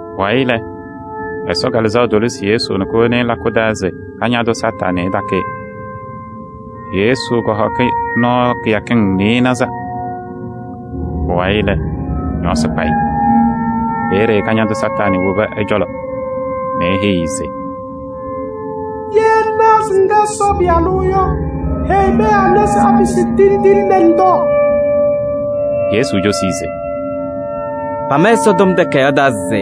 Pʋwayɩ lɛ, Ɛsɔ Kalɩzaɣ tolisi Yesu nɛ kowoni-i lakʋ taa se Kañadʋ Satanɩ ɛtakɩ-ɩ. Yesu kɔhɔkɩ nɔɔ kɩyakɩŋ nɩɩnaza. Pʋwayɩ lɛ, ñɔɔsɩ kpa-ɩ. Peeye Kañadʋ Satanɩ wobi ɛ-cɔlɔ nɛ eheyi-i se: “Ye ŋnaɣ se ŋkɛ Ɛsɔ Pɩyalʋ yɔ, heyi pɛɛ anɛ se apɩsɩ tindine nɛ ŋtɔɔ.” Yesu cosi-i se: “Pama Ɛsɔtɔm Takayaɣ taa se: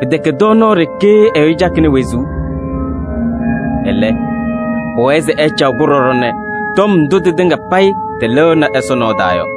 ‘Pɩtɛkɛ tɔɔnaɣ ɖeke ɛyʋ cakɩnɩ wezuu. Ɛlɛ, pʋwɛɛ se ɛcaɣ-kʋ ɖɔɖɔ nɛ tɔm ndʋ tɩtɩŋa payɩ tɩlɩɣnɩ Ɛsɔ nɔɔ taa yɔ.’”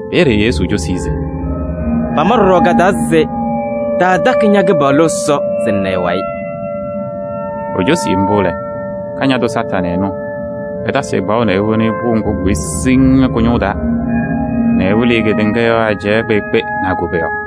Peeye Yesu cosi-i se: “Pama ɖɔɖɔ ka-taa se: ‘Taatakɩ ña-Kɩpaɣlʋ Ɛsɔ se ŋna ɛ-wayɩ.’” Ecosi mbʋ lɛ, Kañadʋ Satanɩ ɛnʋ ɛtasɩ-ɩ kpaɣʋ nɛ ewoni-i pʋʋ ŋgʋ kʋkʋyɩ siŋŋ yɔ kʋ-ñʋʋ taa nɛ ɛwɩlɩ-ɩ kedeŋa yɔɔ ajɛɛ kpeekpe nɛ a-koboyaɣ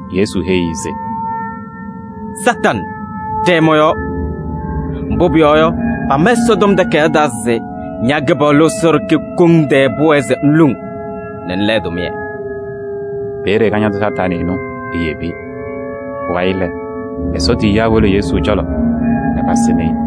Yesu heyi-i se: “Satanɩ ɖɛɛ mɔ-yɔɔ! Mbʋ pʋyɔɔ yɔ, pama Ɛsɔtɔm Takayaɣ taa se: ‘Ña-Kɩpaɣlʋ Ɛsɔ ɖeke koŋ tɛɛ pʋwɛɛ se ŋluŋ nɛ ŋla ɛ-tʋmɩyɛ.’” Peeye Kañadʋ Satanɩ yebi-i. Pʋwayɩ lɛ, Ɛsɔ tiyiyaa wolo Yesu cɔlɔ nɛ pasɩnɩ-ɩ.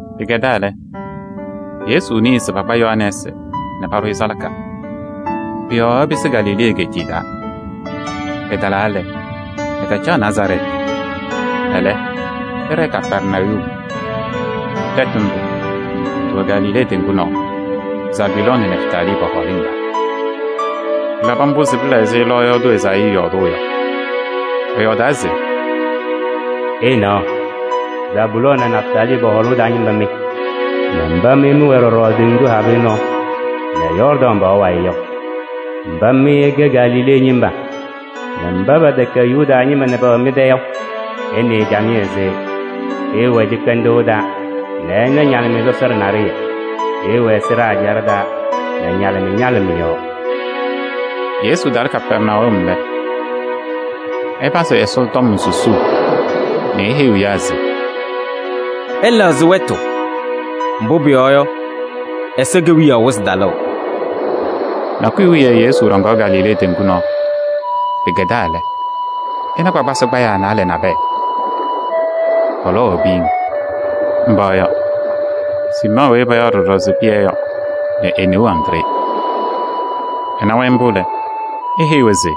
Pɩkɛdaa lɛ, Yesu nɩɩ se pakpa Yohanɛɛsɩ nɛ paɖʋ-ɩ salaka. Pʋ-yɔɔ ɛpɩsɩ Galilee egeetiye taa. Ɛtalaa lɛ, ɛtacaɣ Nazarɛɛtɩ. Ɛlɛ, ɛɖɛɛ Kapɛrnayum. Tɛtʋ ndʋ tɩwɛ Galilee teŋgu nɔɔ, Zabulɔɔ nɛ Nɛftalii pɔ-hɔɔlɩŋ taa. Pɩlabɩ mbʋ se pɩla ɛzɩ lɔɔyaɣ tʋ Ezaayii yɔɔdʋʋ yɔ. Ɛyɔɔdaa se: “Ɩnaɣ, Zabulɔɔ nɛ Nɛftalii pɔ-hɔɔlɩŋ taa ñɩma mɩ nɛ mba mɩ mɩwɛ ɖɔɖɔ teŋgu habɩyɛ nɔɔ nɛ Yɔɔrdaŋ pɔɔ wayɩ yɔ! Mba mɩ ɩkɛ Galilee ñɩma nɛ mba pɛtɛkɛ Yuda ñɩma yɔ pɛwɛɛ mɩ-tɛ yɔ! Ɩnɩɩ camɩyɛ se: ɩɩwɛ cɩkpɛndʋʋ taa nɛ ɩna ñalɩmɩyɛ sɔsɔɖɛ naɖɩyɛ! Ɩɩwɛ sɩɖaa ɛjaɖɛ taa nɛ ñalɩmɩyɛ ñalɩ mɩ-yɔɔ.” Yesu talɩ Kapɛrnayum lɛ, ɛpazɩ Ɛsɔtɔm susuu nɛ eheyiɣ ɛyaa se: “Ɩlɛɣzɩ wɛtʋ, mbʋ pʋyɔɔ yɔ, Ɛsɔ Kewiyaɣ wɩzɩ talʋʋ!” Nakʋyʋ wiye Yesu ɖɔŋaɣ Galilee teŋgu nɔɔ. Pɩkɛdaa lɛ, ɛna kpakpasɩ kpayaa naalɛ nabɛyɛ, pɔlɔwaɣ piyiŋ. Mba yɔ: Siimɔɔ weyi payaɣ ɖɔɖɔ se Pɩyɛ yɔ nɛ e-neu Andree. Ɛna-wɛ mbʋ lɛ, eheyi-wɛ se: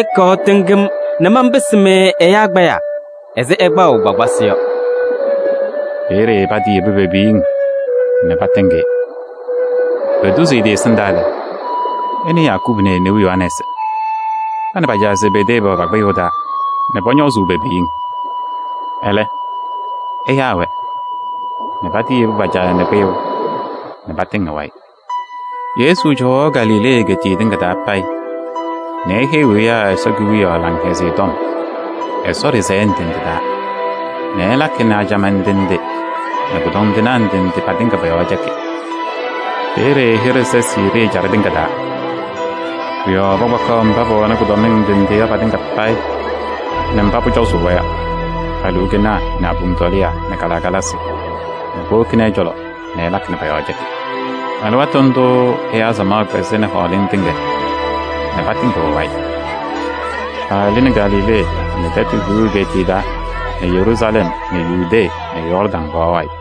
“Ɩkɔɔ ɩtɩŋ-m nɛ manpɩsɩ-mɩ ɛyaa kpayaa ɛzɩ ɩkpaɣʋ kpakpasɩ yɔ.” Peeye patiyebi pe-piyiŋ nɛ patɩŋ-ɩ. Etuzi ɛ-tɩ ɛsɩndaa lɛ, ɛna Yakubu nɛ e-neu Yohanɛɛsɩ, pa nɛ pa-caa Zebedee pɛwɛ pa-kpɩyʋʋ taa nɛ pɔñɔɔzʋʋ pe-piyiŋ. Ɛlɛ, ɛyaa-wɛ nɛ patɩyebu pa-caa nɛ kpɩyʋʋ nɛ patɩŋ ɛ-wayɩ. Yesu cɔwaɣ Galilee egeetiye tɩŋa taa payɩ nɛ eheyiɣ ɛyaa Ɛsɔ Kewiyaɣ Laŋhɛzɩyɛ Tɔm Ɛsɔ ɖɩsɛyɛ ndɩ ndɩ taa nɛ ɛlakɩ nɛ ajamaa ndɩ ndɩ nɛ kʋdɔndɩnaa ndɩ ndɩ patɩŋa pɔ-yɔɔ cɛkɩ. Peeye ɛ-hɩɖɛ sɛ Siirii ɛjaɖɛ tɩŋa taa. Pʋ-yɔɔ pakpakaɣ mba pɛwɛnɩ kʋdɔmɩŋ ndɩ ndɩ yɔ patɩŋa nɛ mba pʋcɔzʋʋ-wɛ yɔ: aluukenaa nɛ abom tɔlɩyaa nɛ kalɩkalasɩ nɛ powokini ɛ-cɔlɔ nɛ ɛlakɩ nɛ pɔ-yɔɔ cɛkɩ. Alɩwaatʋ ndʋʋ ɛyaa samaɣ kpɛzɩnɩ hɔɔlɩŋ tɩŋa nɛ patɩŋɩɣ ɛ-wayɩ. Paalɩnɩ Galilee nɛ Tɛtʋ Hiu egeetiye taa nɛ Yeruusalɛm nɛ Yudee nɛ Yɔɔrdaŋ pɔɔ wayɩ.